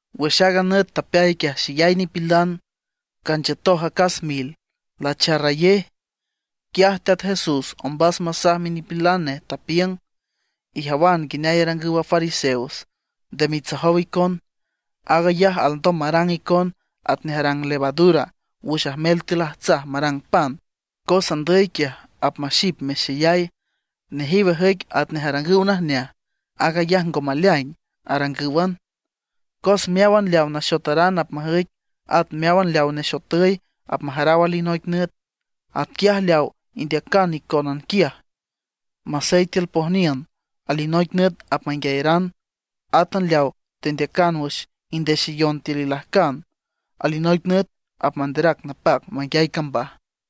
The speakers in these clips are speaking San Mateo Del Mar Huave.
Wüx aaga nüt tapeay quiaj xeyay nipilan, canchiütoj acas mil, lacharrayej. Quiaj Teat Jesús ombas masaj minipilan nej, tapiüng: ―Ijawan nguineay arangüw a fariseos, nde mitsojow icon. Aag ayaj alndom marang icon atnej arang levadura wüx ajmel tiül ajtsaj marang pan, cos andüy quiaj apmaxip mexeyay. Nejiw ajüic atnej arangüw najneaj; aag ayaj ngo maleaing, arangǘwan. Cos meáwan leaw naxotaran apmajüic, at meáwan leaw nexotüy apmajaraw alinoic nüt. Atquiaj leaw indeacan icónan quiaj masey tiül pojniün, alinoic nüt apmanguiayaran. Átan leaw tendeacan wüx indexeyon tiül ilajcan, alinoic nüt apmanderac napac manguiay cambaj.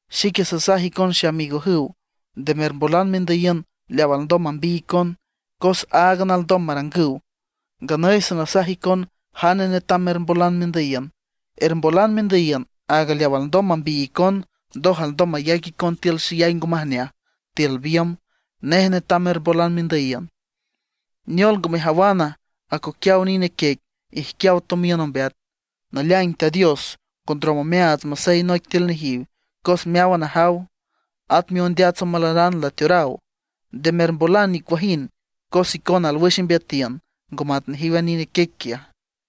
’Xique sasaj icon xeamigojüw, nde mermbolan mendüyiün leaw alndom mambiy icon, cos áagan alndom marangüw. Nganüy sanasaj icon jane netam mermbolan mendüyiün: ermbolan mendüyiün aaga leaw alndom mambiy icon, ndoj alndom mayac icon tiül xeyay ngo majneaj, tiül biümb. Nej netam mermbolan mendüyiün. ’¿Neol ngo mejawana, acoquiaw nine quiec ijquiaw tomiün ombeat? Naleaing Teat Dios ngo ndrom omeaats masey noic tiül nejiw, cos meáwan ajaw. At miondeats omalaran lateoraw. Nde mermbolan nicuajind, cos icona alwüx imbeatiün, ngo mat nejiw a nine quiec quiaj.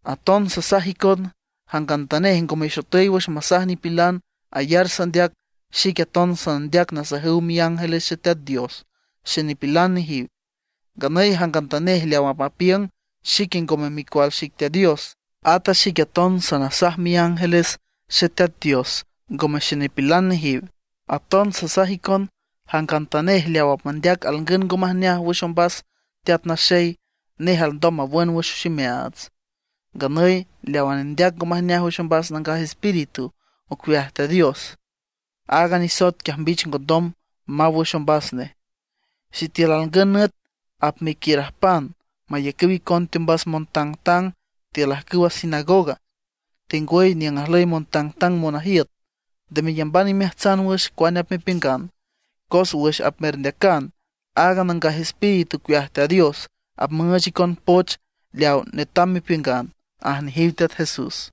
’Aton sasaj icon, jangantanej ngo mexotüy wüx masaj nipilan ayar sandeac, xique aton sanandeac nasajüw miángeles Xeteat Dios xenipilan nejiw. Nganüy jangantanej leaw apmapiüng xique ngome micual xic Teat Dios, at a xique aton sanasaj miángeles Xeteat Dios ngome xenipilan nejiw. ’Aton sasaj icon, jangantanej leaw apmandeac alngün ngo majneaj wüx ombas Teat Naxey, nej alndom nawün wüx ximeaats. Nganüy leawa nendeac ngo majneaj wüx ombas Nangaj Espíritu ocueaj Teat Dios, aaga nisoet quiaj mbich ngondom maw wüx ombas nej. ’Sitiül alngün nüt apmequiürajpan mayacüw icon teombas montangtang tiül ajcüwa sinagoga, tengwüy niüng ajlüy montangtang monajiüt, nde meyamban imeajtsan wüx cuane apmepiüngan; cos wüx apmerndeacan, aaga Nangaj Espíritu ocueaj Teat Dios apmüüch icon poch leaw netam mepiüngan ―aj nejiw Teat Jesús.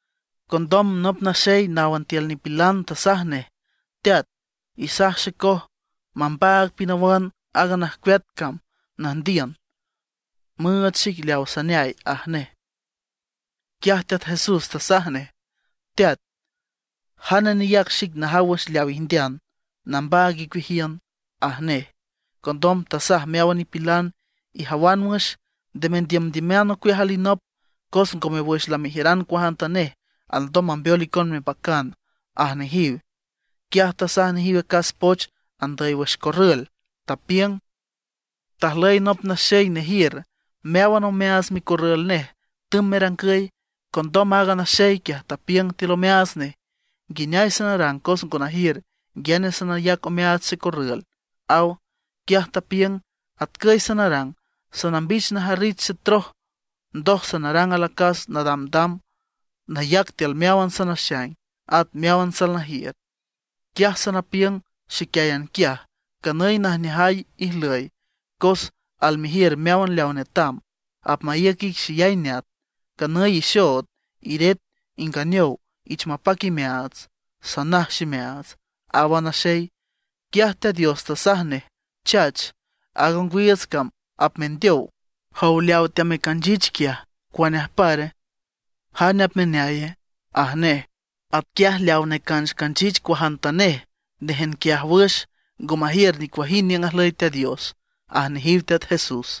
Condom nop naxey náwan tiül nipilan tasaj nej: ―Teat, isaj xecoj mambaag pinawan aaga najcueat cam nüjndiün, müüch xic leaw saneay ―aj nej. Quiaj Teat Jesús tasaj nej: ―Teat ¿jane neyac xic najaw wüx leaw ijndean, nambaag icueajiün? ―aj nej. Condom tasaj meáwan nipilan: ―Ijawan wüx, nde mendiümdiüman ocueaj alinop; cos ngome wüx lamejiüran cuajantanej alndom mambeol icon mepacan ―aj nejiw. Quiaj tasaj nejiw acas poch andüy wüx corrül, tapiüng: ―Tajlüy nop naxey nejiür, meáwan omeaats micorrül nej tümb merangüy. Condom aaga naxey quiaj tapiüng tiül omeaats nej: “¿Nguineay sanarang cos ngo najiür nguiane sanayac omeaats xecorrül?”, aw. Quiaj tapiüng: “Atcüy sanarang, sanambich najarrich xetroj, ndoj sanarang alacas nadamdam, nayac tiül meáwan sanaxaing, at meáwan salnajiür. Quiaj sanapiüng xiquiáyan quiaj: Canüy najneajay ijlüy cos almejiür meáwan leaw netam, apmaíüc ic xeyay neat. Canüy ixood, iret, inganeow, ich mapac imeaats, sanaj ximeaats”, aw a naxey. Quiaj Teat Dios tasaj nej: “¡Chach! Aaga ongwiiüts cam apmendeow. Jow, leaw teamecanchich quiaj, ¿cuane ajpare? ¿jane apmaneaye?” aj nej. ’Atquiaj leaw necancanchich cuajantanej néjan quiaj wüx, ngo majiür nicuajind niüng ajlüy Teat Dios ―aj nejiw Teat Jesús.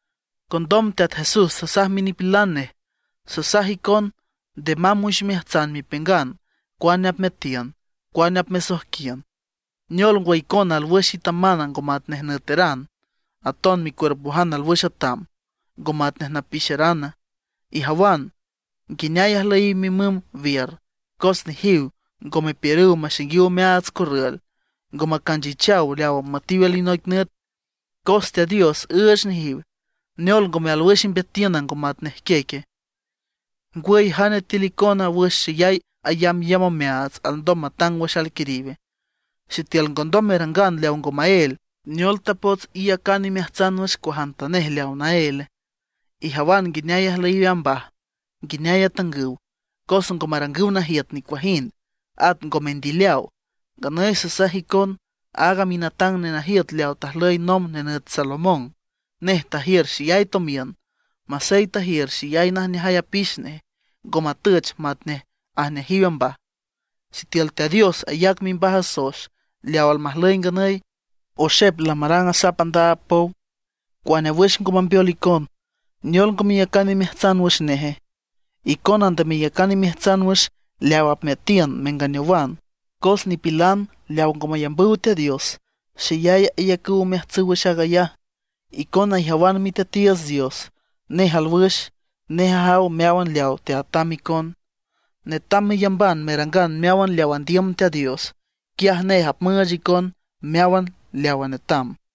Condom Teat Jesús tasaj minipilan nej: ―Sasaj icon, nde mamb wüx imeajtsan mepiüngan cuane apmeatiün, cuane apmesojquiün. ¿Neol ngwa, icona alwüx itaman, ngo matnej nüeteran; aton micuerpojan alwüx atam, ngo matnej napixerana? Ijawan nguineay ajlüyiw mimüm wiür, cos nejiw ngo mepiürüw maxainguiw omeaats corrül, ngo macanchichaw leaw apmüetiw alinoic nüt, cos Teat Dios üüch nejiw. ¿Neol ngome alwüx imbeatiüna, ngo matnej quieque? ¿Ngwüy jane tiül icona wüx xeyay ayambyamb omeaats alndom matang wüx alquiriwe? Sitiül ngondom merangan leaw ngo maél, ¿neol tapots iyacan imeajtsan wüx cuajantanej leawa naéle? ’Ijawan nguineay ajlüyiw a mbaj, nguineay atangüw. Cos ngo marangüw najiüt nicuajind, at ngo mendileaw. Nganüy sasaj icon, aaga minatang nenajiüt leaw tajlüy nomb nenüt Salomón, nej tajiür xeyay tomiün. Masey tajiür xeyay najneajay apix nej; ngo matüch matnej ajneajiw a mbaj. Sitiül Teat Dios ayac mimbaj a soex leaw almajlüy nganüy, oxep lamarang asap andaab pow, cuane wüx ngo mambeol icon. ¿Neol ngo meyacan imeajtsan wüx neje? Icona nde meyacan imeajtsan wüx leaw apmeatiün menganeowan. Cos nipilan leaw ngo mayambüw Teat Dios, xeyay ayacüw omeajtsüw wüx aag ayaj. Icona ijawan Miteatiiüts Dios, nej alwüx, nej ajaw meáwan leawa teatam icon. Netam meyamban merangan meáwan leaw andiüm Teat Dios; quiaj nej apmüüch icon meáwan leawa netam.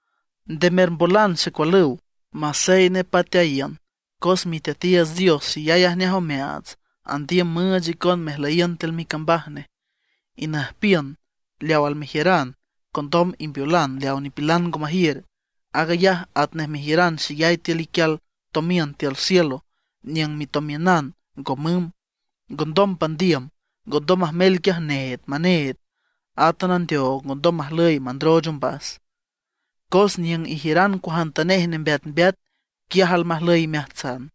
’Nde mermbolan xecualüw, masey nepateayiün, cos Miteatiiüts Dios xeyay ajneaj omeaats, andiüm müüch icon mejlüyiün tiül micambaj nej. Inüjpiün leaw almejiüran, condom imbeolan leaw nipilan ngo majiür. Aag ayaj atnej mejiüran xeyay tiül iquial tomiün tiül cielo niüng mitomiünan ngo mümb, ngondom pandiüm, ngondom majmel quiaj need maneed, átan a ndeoog ngondom majlüy mandrooch ombas. Cos niüng ijiüran cuajantanej nembeatmbeat, quiaj almajlüy imeajtsan.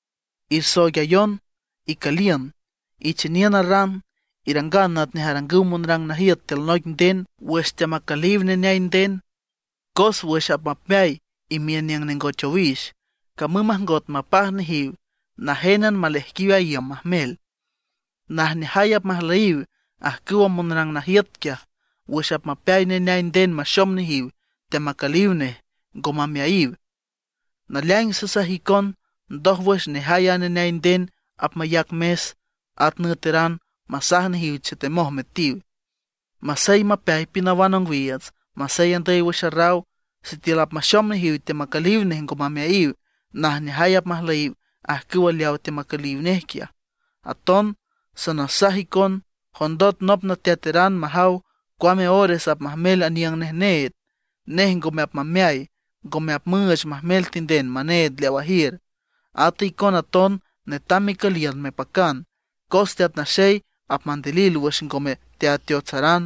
’Ersooigayon, icüliün, icheniün a ran. Irangan atnej arangüw monrang najiüt tiül noic nden wüx teamacüliw neneay nden. Cos wüx apmapeay imiün niüng nengoch owix, camüm majngot mapaj nejiw, najénan maleaijquiw a iüm majmel. Najneajay apmajlüyiw ajcüw monrang najiüt quiaj wüx apmapeay neneay nden maxom nejiw teamacüliw nej, ngo mameayiw. Naleaing sasaj icon, ndójwüx nejay a neneay nden apmayac mes, at nüeteran, masaj nejiw chetemoj metiw. Masey mapeay pinawan ongwiiüts, masey andüy wüx arraw, sitiül apmaxom nejiw teamacüliw nej ngo mameayiw, najneajay apmajlüyiw ajcüw leawa teamacüliw nej quiaj. Aton sanasaj icon, jondot nop nateateran majaw cuame ores apmajmel aniüng nej need, nej ngome apmameay, ngome apmüüch majmel tinden maneed leaw ajiür. Ata icona aton netam mecüliün mepacan, cos Teat Naxey apmandilil wüx ngome teateotsaran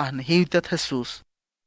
―aj nejiw Teat Jesús.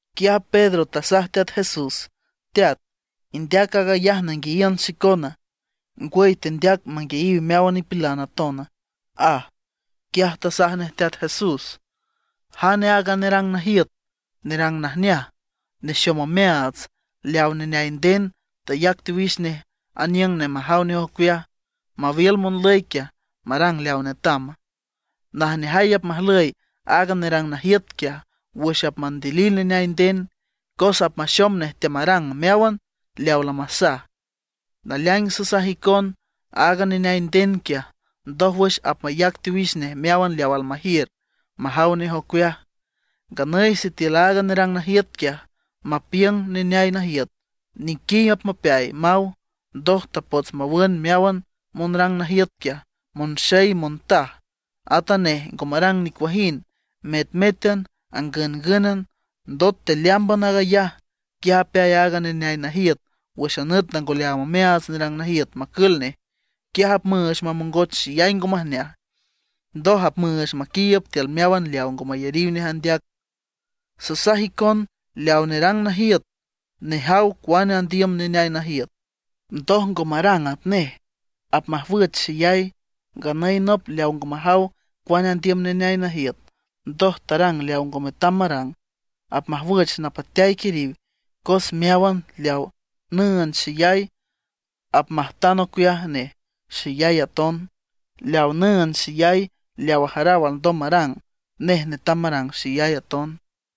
Quiaj Pedro tasaj Teat Jesús: ―Teat, ¿indeac aag ayaj nanguiayiün xicona, ngwüy tendeac manguiayiw meáwan nipilan atona? ―aj. Quiaj tasaj nej Teat Jesús: ―¿Jane aaga nerang najiüt, nerang najneaj, nexom omeaats, leaw neneay nden tayac teowix nej aniüng nej majaw nej ocueaj, mawiül monlüy quiaj marang leaw netama? Najneajay apmajlüy aaga nerang najiüt quiaj wüx apmandilil neneay nden, cos apmaxom nej teamarang meáwan leaw lamasaj. Naleaing sasaj icon, aaga neneay nden quiaj ndójwüx apmayac teowix nej meáwan leaw almajiür majaw nej ocueaj. Nganüy sitiül aaga nerang najiüt quiaj mapiüng neneay najiüt nequiy apmapeay, maw, ndoj tapots mawüüch meáwan monrang najiüt quiaj, monxey, montaj. At a nej ngo marang nicuajind, metmétan, angüngǘnan. Ndot tealeámban aag ayaj, quiaj apeay aaga neneay najiüt wüx a nüt lango leaam omeaats nerang najiüt macül nej. Quiaj apmüüch mamongoch xeyay ngo majneaj, ndoj apmüüch maquiiüb tiül meáwan leaw ngo mayariw nej andeac. ’Sasaj icon, leaw nerang najiüt nejaw cuane andiüm neneay najiüt, ndoj ngo marang atnej, apmajwüch xeyay. Nganüy nop leaw ngo majaw cuane andiüm neneay najiüt, ndoj tarang leaw ngo metam marang, apmajwüch napateay quiriw. Cos meáwan leawa nüünd xeyay, apmajtan ocueaj nej xeyay aton, leaw nüünd xeyay leaw ajaraw alndom marang, nej netam marang xeyay aton.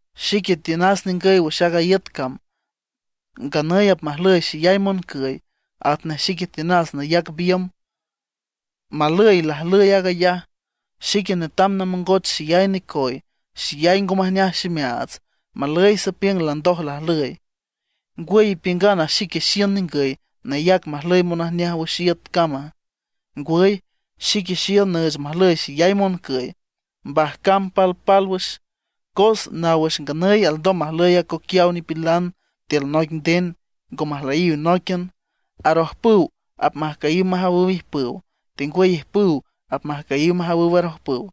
’Xique tiünas ningüy wüx aaga iüt cam, nganüy apmajlüy xeyay moncüy, atnej xique tiünas nayac biümb. ¡Malüy lajlüy aag ayaj! Xique netam namongoch xeyay necoy. Xeyay ngo majneaj ximeaats ¡Malüy sapiüng landoj lajlüy! ¿Ngwüy ipiüngana xique xiün ningüy nayac majlüy monajneaj wüx iüt cama? Ngwüy, xique xiün nüüch majlüy xeyay moncüy, mbajcan palpálwüx. Cos naw wüx nganüy alndom majlüy acoquiaw nipilan tiül noic nden ngo majlüyiw nóiquian. Arojpüw apmajcüyiw majawüw ijpüw, tengwüy ijpüw apmajcüyiw majawüw arojpüw.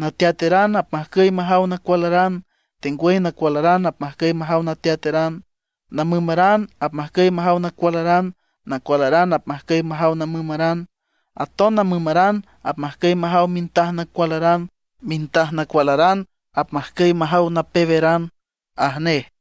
Nateateran apmajcüy majaw nacualaran, tengwüy nacualaran apmajcüy majaw nateateran. Namümaran apmajcüy majaw nacualaran, nacualaran apmajcüy majaw namümaran. Aton namümaran apmajcüy majaw mintaj nacualaran, mintaj nacualaran apmajcüy majaw napeweran ―aj nej.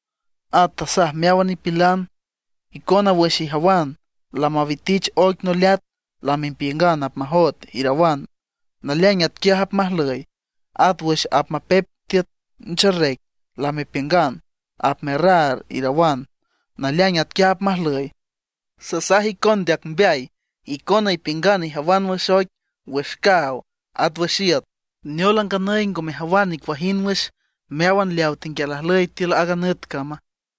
At tasaj meáwan nipilan: ―Icona wüx ijawan lamawitich oic noleat lamepiüngan: Apmajoet, irawan. Naleaing atquiaj apmajlüy. At wüx apmapep tiüt ncherrec lamepiüngan: Apmerraar, irawan. Naleaing atquiaj apmajlüy. ¡Sasaj icon ndeac mbeay! Icona ipiüngan ijawan wüx oic, wüx caaw, at wüx iüt. ¿Neol a nganüy ngo mejawan nicuajind wüx meáwan leaw tenguial ajlüy tiül aaga nüt cama?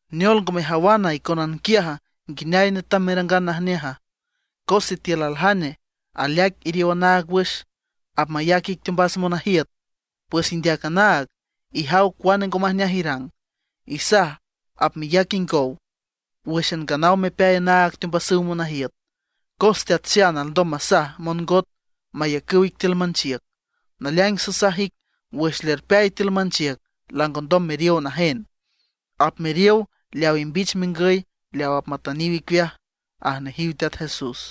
’¿Neol ngo mejawan icónan quiaj nguineay netam merangan najneaja? Cos sitiül aljane aleaic iriow anaag wüx, apmayac ic teombas monajiüt, pues indeac anaag, ijaw cuane ngo majneaj irang, isaj apmeyac ingow wǘxan nganaw mepeay anaag teombasüw monajiüt. Cos teat xan alndom masaj mongot mayacüw ic tiül manchiüc. Naleaing sasaj ic, wüx lerpeay tiül manchiüc langondom meriow najen, apmeriow leaw imbich mengüy leaw apmatüniw icueaj ―aj nejiw Teat Jesús.